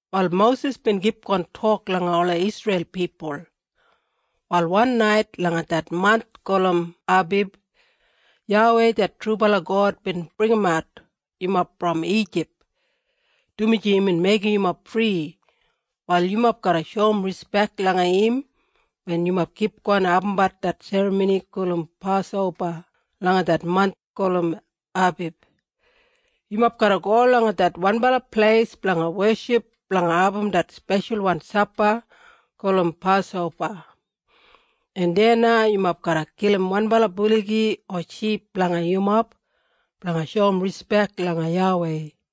Wal Mosis bin kipgon tok langa ola Isreil pipul, “Wal wan nait langa det manth gulum Abib, YAWEI det trubala God bin bringimat yumob brom Ijip. Dumaji imbin meigim yumob fri, wal yumob garra shoum rispek langa im wen yumob kipgon abumbat det serramoni gulum Pasoba langa det manth gulum Abib. Yumob garra go langa det wanbala pleis blanga weship blanga abum det speshalwan sapa gulum Pasoba en deya na yumob garra kilim wanbala buligi o ship blanga yumob, blanga shoum rispek langa YAWEI.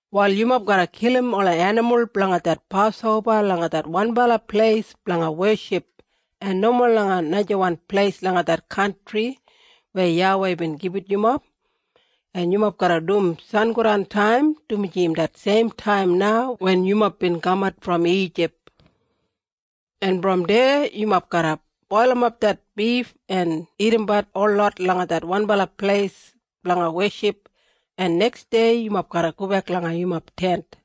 “Wal yumob garra kilim ola enimul blanga det Pasoba langa det wanbala pleis blanga weship en nomo langa najawan pleis langa det kantri weya YAWEI bin gibit yumob. En yumob garra dum sangodantaim, dumaji im det seimtaim na wen yumob bin kamat brom Ijip. En brom deya yumob garra boilimap det bif en dagadagatbat holot langa det wanbala pleis blanga weship, en neksdei yumob garra gobek langa yumob tent.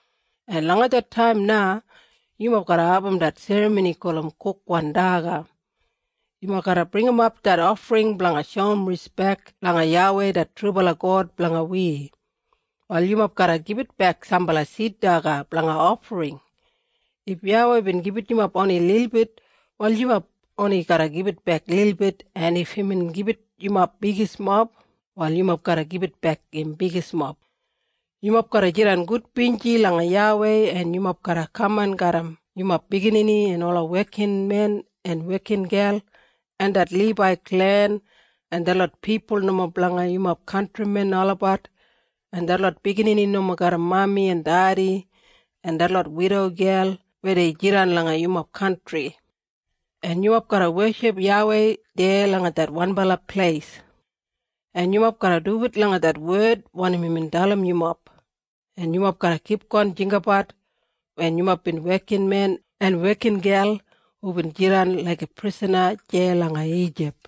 en langa det taim na yumob garra abum det serramoni gulum Kukwan Daga. Yumob garra bringimap det ofring blanga shoum rispek langa YAWEI det trubala God blanga wi. Wal yumob garra gibitbek sambala sid daga blanga ofring. If YAWEI bin gibit yumob oni lilbit wal yumob oni garra gibitbek lilbit en if imbin gibit yumob bigismob wal yumob garra gibitbek im bigismob. Yumob garra jidan gudbinji langa YAWEI en yumob garra kaman garram yumob biginini en ola wekinmen en wekingel en det Libai klen en detlot pipul nomo blanga yumob kantrimen olabat en detlot biginini nomo garram mami en dedi en detlot widogel weya dei jidan langa yumob kantri. En yumob garra weship YAWEI deya langa det wanbala pleis. En yumob garra duwit langa det wed wanim imbin dalim yumob, en yumob garra kipgon jinggabat wen yumob bin wekinmen en wekingel hubin jidan laiga prisana deya langa Ijip.”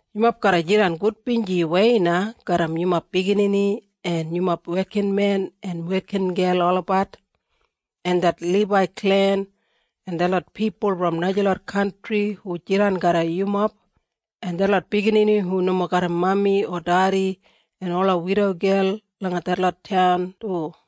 Yumob garra jidan gudbinjiwei na garram yumob biginini en yumob wekinmen en wekingel olabat, en det Libai klen en detlot pipul brom najalot kantri hu jidan garram yumob, en detlot biginini hu nomo garram mami o dedi, en ola widogel langa detlot taun du.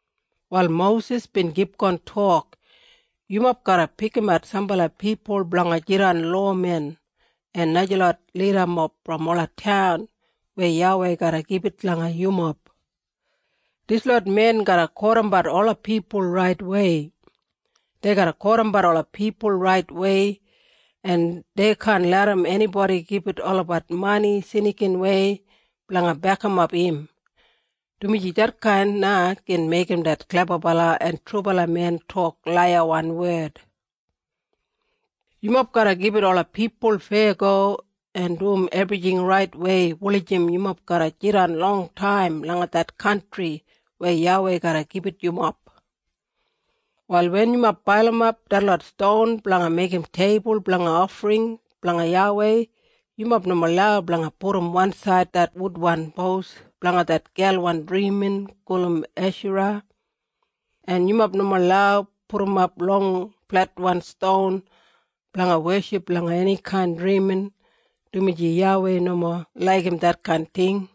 Wal Mosis bin kipgon tok, “Yumob garra pikimat sambala pipul blanga jidan lowamen en najalot lidamob brom ola taun weya YAWEI garra gibit langa yumob. Dislot men garra kotimbat ola pipul raitwei. Dei garra kotimbat ola pipul raitwei. En dei kaan larram enibodi gibit olabat mani snikinwei blanga bekimap im, dumaji detkain na gin meigim det klebabala en trubala men tok laiyawan wed. Yumob garra gibit ola pipul feyago en dum ebrijing raitwei wulijim yumob garra jidan longtaim langa det kantri weya YAWEI garra gibit yumob. “Wal wen yumob pailimap detlot ston blanga meigim teibul blanga ofring blanga YAWEI, yumob nomo lau blanga pudum wansaid det wudwan pos blanga det gelwan drimin gulum Eshara. En yumob nomo lau pudumap long fletwan ston blanga weship langa enikain drimin, dumaji YAWEI nomo laigim detkain ting.